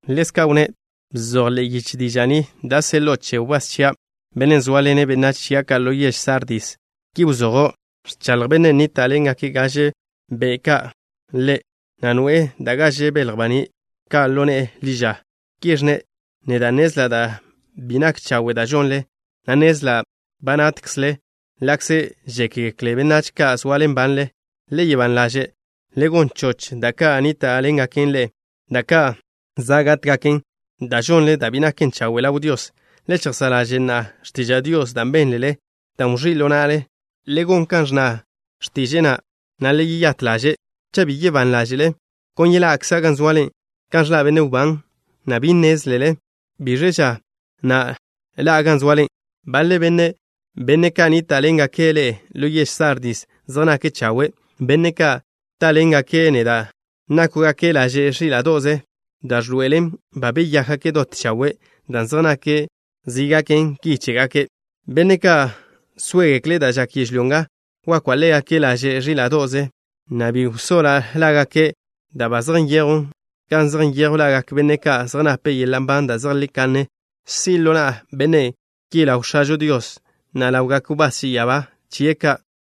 Ḻezka' wnné': “Bzoj ḻe'e yiche diža' ni da' seḻo'o che wbás chia', bennen' zóaḻene' benách chia' ka' ḻo yež Sardis. Ki wzojo': Ẕchaḻj Bennen' nníta'ḻengak gaže be' ka' Ḻe', na' noe'e da' gaže belj baní' ka' ḻo ne'e ḻi ža. Ki ẕnne': Neda' nnezla' da' bi nak chawe' da' žonle, na' nnezla' ba natkzle ḻa'kze žékgekle benách ka' zoale nbanle. Le soa ban ḻaže'. Le gon choch da' ka' nníta'ḻengaken ḻe'e, da' ka' za' gátgaken, dan' žonle da' bi naken chawe' ḻaw Dios. Le chejsá' ḻaže' na'a x̱tiža' Dios da' bénlele, dan' wẕí' ḻo na'le. Le gon kan ẕnna x̱tiže'e na', na' le yeyát ḻaže'. Cha' bi gak ban ḻáže'le, kon yeḻa'kza' gan zoale kan ẕḻa' benne' wbán, na' bi nnézlele biẕ ža na' ḻa'a gan zoale. Baḻe benne', benne' ka' nníta'ḻengake' ḻe'e ḻo yež Sardis, zej nake' chawe'. Benne' ka' táḻengake' neda', nákwgake' laže' ẕíla'do'ze da' ẕḻoe'elen ba beyákgake' dot chawe' dan' zej nake' zi gaken ki chégake'. Benne' ka' sóegekle' da' žak yežlyó nga wakwa' ḻégake' laže' ẕíla'do'ze, na' bi wsoḻa' lágake' da' ba zej nyejwn gan zej nyejw lagak benne' ka' zej nape' yeḻa' nban da' zejlí kanne. Si' ḻo na'a benne' ki ḻaw X̱ažo Dios, na' ḻawgak wbás che ya'abá chie' ka'.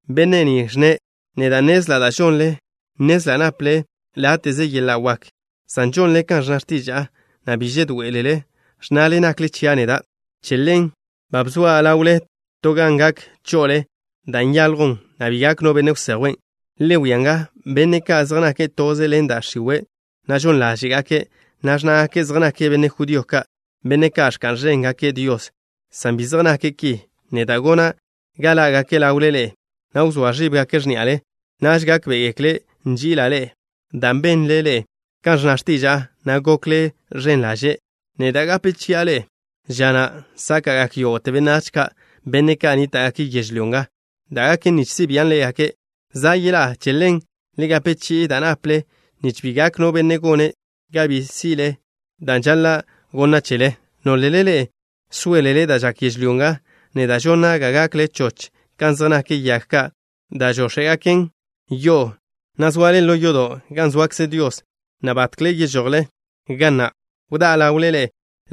Benne' ni ẕnne': Neda' nnezla' da' žonle. Nnezla' naple láte'ze yeḻa' wak, san žonle kan ẕnna x̱tiža'a, na' bi žedoé'elele ẕnnale nakle chia' neda'. Che ḻen ba bzoa' ḻawle to gan gak cho'ole da' nyaljwn, na' bi gak no benne' wsejwen'. Le wia nga, benne' ka' zej nake' toze ḻen da' x̱iwe', na' žon ḻáže'gake', na' ẕnnágake' zej nake' benne' judío ka', benne' ka' ẕka'n ẕéngake' Dios, san bi zej nake' ki, neda' gona' ga ḻá'gake' ḻawle ḻe'e, na' wzóa ẕíbgake' x̱ní'ale. Naž gákbe'egekle' nži'ila' ḻe'e. Dan' benle ḻe'e kan ẕnna x̱tiža'a, na' gokle ẕen ḻaže', neda' gape chi'a ḻe'e ža na' sáka'gak yógo'te benách ka', benne' ka' nníta'gake' yežlyó nga, da' gaken nich si' bian' ḻégake'. Za' yeḻá'a. Che ḻen le gape chi'i da' naple, nich bi gak no benne' gone' ga bi si'le dan' žaḻa' gonna' chele. Nólele ḻe'e sóelele da' žak yežlyó nga, neda' gona' ga gakle choch kan zej nak yag ka' da' žóx̱e'gaken yo'o, na' soale ḻo yodo' gan zoakze Dios, na' batkle yežojle ga na'. Wdá'a ḻawle ḻe'e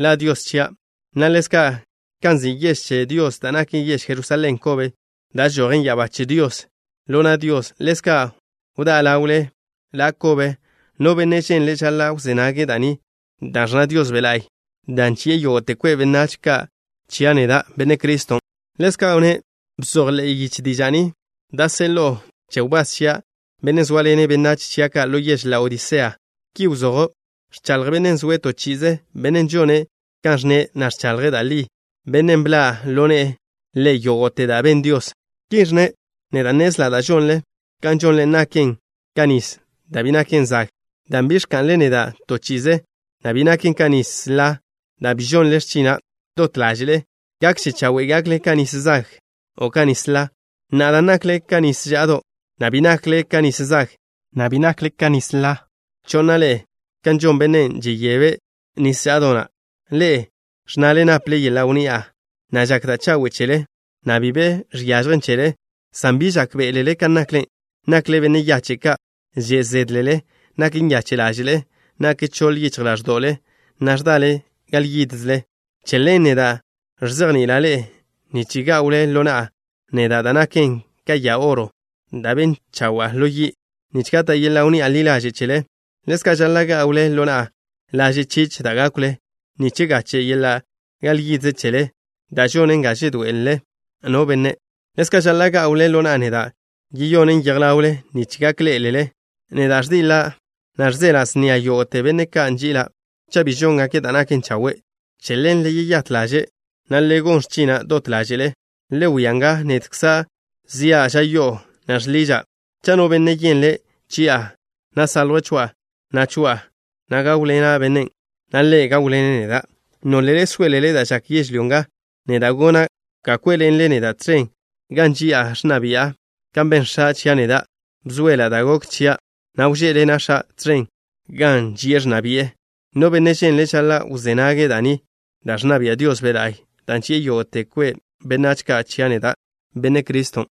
La Dios chia', na' ḻezka' kan nzi' yež che Dios da' naken yež Jerusalén kobe, da' žojen ya'abá che Dios ḻo na' Dios. Ḻezka' wdá'a ḻawle ḻe'e la' kobe. No benne' ženle' žaḻa' wzé nage' da' ni da' ẕnna Dios Be' La'y, dan' ži'e yógo'te kwe' benách ka' chia' neda', Benne' Cristo.” Ḻezka' wnné': “Bzoj ḻe'e yiche diža' ni da' seḻo'o che wbás chia', bennen' zóaḻene' benách chia' ka' ḻo yež Laodisea. Ki wzojo': Ẕchaḻj Bennen' zoe' to chi'ize, Bennen' žone' kan ẕnne', na' ẕchaḻje' da' li, Bennen' bḻa' ḻo ne'e Ḻe' yógo'te da' ben Dios. Ki ẕnne': Neda' nnezla' da' žonle. Kan žonle naken ka nis da' bi naken zag dan' bi ẕka'nle neda' to chi'ize, na' bi naken ka nis ḻa dan' bi žonle x̱china' dot ḻáže'le. Gakže chawe' gakle ka nis zag o ka nis ḻa. Na'a dan' nakle ka nis ža'do', na' bi nakle ka nis zag, na' bi nakle ka nis ḻa, cho'na' ḻe'e kan žon bennen' žeyebe' nis ža'do' na'. Ḻe'e ẕnnale naple yeḻa' wnni'a, na' žak da' chawe' chele, na' bi be žiažjen chele, san bi žákbe'elele kan nakle. Nakle benne' yache' ka'. Že' zédlele. Nak nyache' ḻáže'le, na' nak choḻ yichj ḻáẕdo'le, na' ẕdale gal yídzele. Che ḻen, neda' ẕzejni'ila' ḻe'e nich gá'wle ḻo na'a neda' da' naken ka ya oro da' ben chawa'a ḻo yi', nich gata' yeḻa' wnni'a ḻi ḻaže' chele. Ḻezka' žaḻa' gá'wle ḻo na'a laže' chich da' gákwle, nich gache' yeḻa' gal yidze chele da' žonen ga žedoe'ele no benne'. Ḻezka' žaḻa' gá'wle ḻo na'a da' yeyonen yej ḻawle nich gak ḻé'elele. Neda' ẕdiḻa', na' ẕzeḻa' snia yógo'te benne' ka' nži'ila' cha' bi žóngake' da' naken chawe'. Che ḻen, le yeyát ḻaže', na' le gon x̱china' dot ḻáže'le. Le wia nga, nedkza' zia' ža yo'o, na' žḻiža'. Cha' no benne' yenle' chi'a, na' saljwe' chia', na' choa'a, na' gáwḻena' bennen', na' ḻe' gáwḻene' neda'. Nólele sóelele da' žak yežlyó nga, neda' gona' ga kwé'ḻenle neda' tẕen gan ži'a ẕnna bi'a, kan ben X̱a' chia' neda'. Bzoela' da' gok chia', na' wžé'ḻena' X̱a' tẕen gan ži'e ẕnna bi'e. No benne' ženle', žaḻa' wzé nage' da' ni da' ẕnna Dios Be' La'y, dan' ži'e yógo'te kwe' benách ka' chia' neda', Benne' Cristo.”